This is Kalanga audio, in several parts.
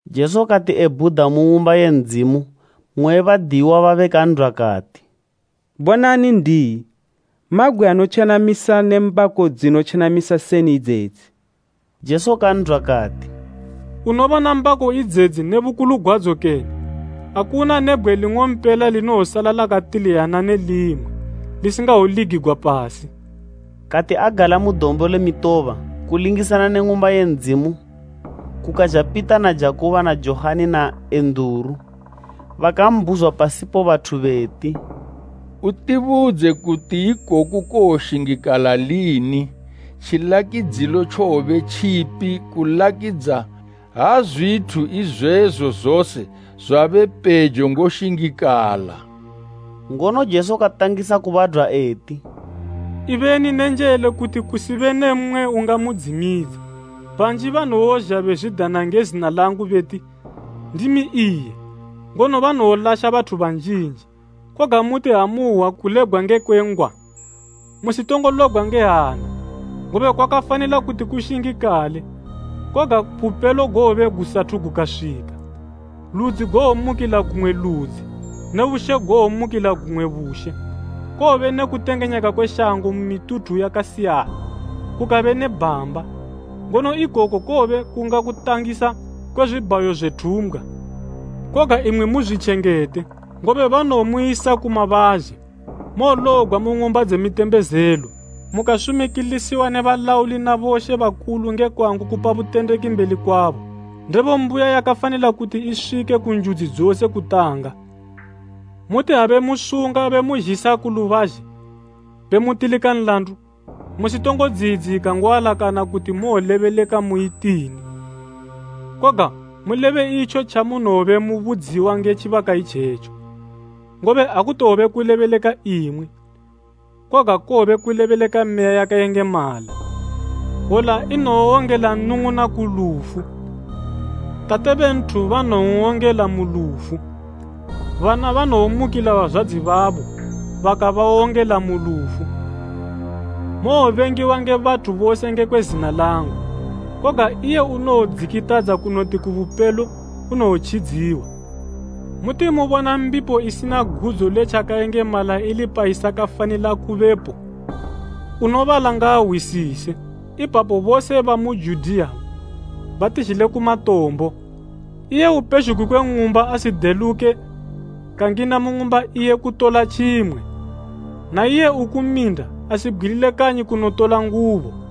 Jesu kati ebhuda mu Ng'umba ye Ndzimu, mmwe we badiyiwa babe kan'dwa kati, “Bonani N'diyi, mabgwe anotjenamisa ne mbako dzinotjenamisa seni idzedzi!” Jesu kan'dwa kati, “Unobona mbako idzedzi ne bukulu gwadzo kene? Akuna ne bgwe ling'ompela linowosala lakatiliyana ne limwe, lisingawoligigwa pasi.” Kati agala mu Dombo le Mitoba, kulingisana ne Ng'umba ye Ndzimu, kukazha Pita na Jakubo na Johani na Enduru bakambhuzwa pasipo bathu beti, “Utibudze kuti ikoku kowoshingikala lini, tjilakidzo tjowobe tjipi kulakidza ha zwithu izwezo zose zwabe pejo ngoshingikala?” Ngono Jesu katangisa kubadwa eti, “Ibeni ne njele kuti kusibe ne mmwe ungamudzimidza. Banji banowozha bezwidana nge zina langu beti, ‘Ndimi iye,’ ngono banowolasha bathu banjinji. Koga muti ha muhwa kulebgwa ngekwe ngwa, musitongo lobgwa nge hana, ngobe kwakafanila kuti kushingikale, koga bupelo gowobe gusathu gukaswika. Ludzi gowomukila gumwe ludzi ne bushe gowomukila gumwe bushe. Kowobe ne kutengenyeka kwe shango mu mituthu yakasiyana, kukabe ne bhamba. Ngono ikoku kowobe kunga kutangisa kwe zwibhayo zwe thumbgwa. “Koga imwi muzwitjengete, ngobe banowomuyisa ku mabazhe, mowolobgwa mu ng'umba dze mitembezelo, mukasumikilisiwa ndi boshe na bomambo nge kwangu kupa butendeki mbeli kwabo. Ndebo mbuya yakafanila kuti iswike ku njudzi dzose kutanga. Muti ha bemusunga bemuzhisa ku lubazhe, bemutilika nlandu, musitongo dziyidzika ngoalakana kuti mowolebeleka muyitini. Koga mulebe itjo tjamunowobe mubudziwa nge tjibaka itjetjo, ngobe akutowobe kulebeleka imwi, koga kowobe kulebeleka Meya yakayengemala. Hwola inowowongela nnung'una ku lufu, tate be nthu banowon'wongela mu lufu, bana banowomukila bazwadzi babo bakabawongela mu lufu. Mowobengiwa nge bathu bose ngekwe zina langu. Koga iye unowodzikitadza kunoti ku bupelo, unowotjidziwa. “Muti mubona mbipo inotjenamisa ili payisakafanila kubepo (unobala ngaahwisise), ipapo bose bamu Judiya batizhile ku matombo. Iye upezhugwi kwe ng'umba asideluke kangina mu ng'umba iye kutola tjimwe; naiye uku minda, asibgwilile kanyi kunotola ngubo.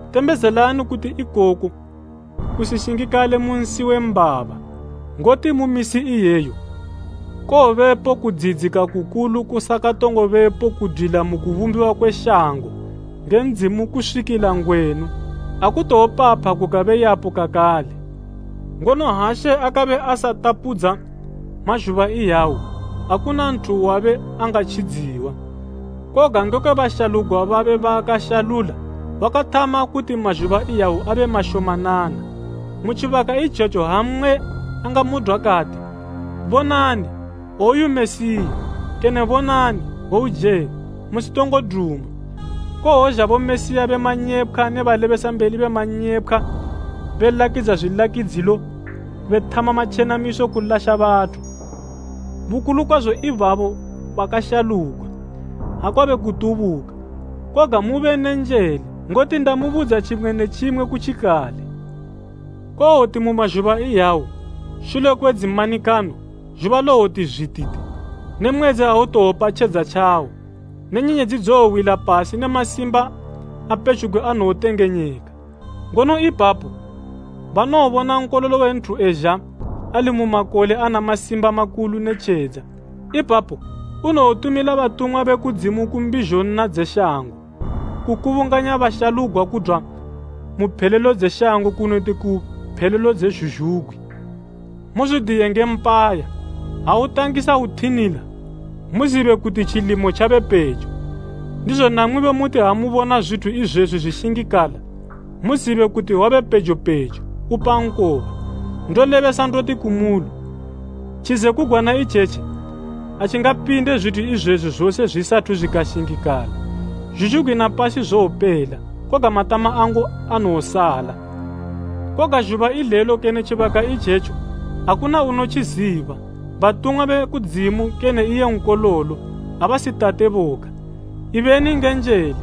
Tembezelani kuti ikoku kusishingikale mu nsi we mbaba. Ngoti mu misi iyeyo kowobepo kudziyidzika kukulu kusakatongo bepo kudwila mu kubumbiwa kwe shango nge Ndzimu kuswikila ngwenu, akutowopapha kukabe yapo kakale. Ngono ha She akabe asatapudza mazhuba iyawo, akuna nthu wabe angatjidziwa. Koga ngekwe bashalugwa babe baakashalula wakathama kuti mazhuba iyawo abe mashomanana. “Mu tjibaka itjetjo ha mmwe angamudwa kati, ‘Bonani woyu Mesiya kene hwouje,’ musitongo duma. Kowozha Bomesiya be manyepkhwa ne balebesambeli be manyepkhwa be lakidza zwilakidzilo bethama matjenamiso kulasha bathu, bukulu kwazo ibabo bakashalugwa, ha kwabe kutubuka. Koga mube ne njele, ngoti ndamubudza tjimwe ne tjimwe kutjikale.” “Kowoti mu mazhuba iyawo, shule kwe dzimanikano, zhuba lowoti zwititi, ne mwedzi awutowopa tjedza tjawo, ne nyenyedzi dzowowila pasi ne masimba a pezhugwi anotengenyeka. Ngono ipapo banowobona Nkololo we Nthu ezha ali mu makole ana masimba makulu ne tjedza. Ipapo unowotumila batumwa be kudzimu ku mbizho nna dze shango, kukubunganya bashalugwa kudwa mu phelelo dze shango kunoti ku phelelo dze zhuzhugwi. “Muzwidiye nge mpaya, ha utangisa uthinila, muzibe kuti tjilimo tjabe pejo. Ndizo namwibo muti ha mubona zwithu izwezwi zwishingikala, muzibe kuti wabe pejo pejo, upa nkoba. Ndolebesa ndoti kumuli, tjizekugwana itjetji atjingapinde zwithu izwezwi zose zwisathu zwikashingikala. Zhuzhugwi na pasi zowopela, koga matama angu anowosala. “Koga zhuba ilelo kene tjibaka itjetjo, akuna unotjiziba, batumwa be kudzimu kene iye Nkololo, abasi Tate boga. Ibeni nge njele,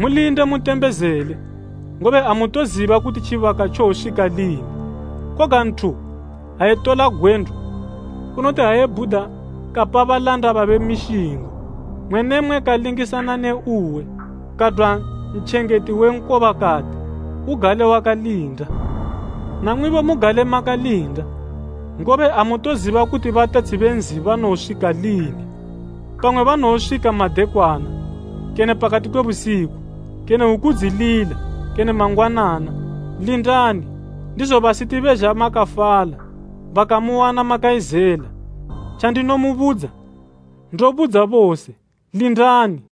mulinde, mutembezele, ngobe amutoziba kuti tjibaka tjowoswika lini. Konga nthu ha etola gwendo, unoti ha ebhuda kapa balanda babe mishingo, mmwe ne mmwe kalingisana ne uwe. Kadwa ntjengeti we nkoba kati, ugale wakalinda. Namwibo mugale makalinda, ngobe amutoziba kuti batetshi be nzi banowoswika lini. Pamwe banowoswika madekwana, kene pakati kwe busiku, kene hwuku dzilila kene mangwanana. Lindani, ndizo basiti bezha makafala, bakamuwana makayizela. Tjandinomubudza, ndobudza bose, ‘Lindani.’”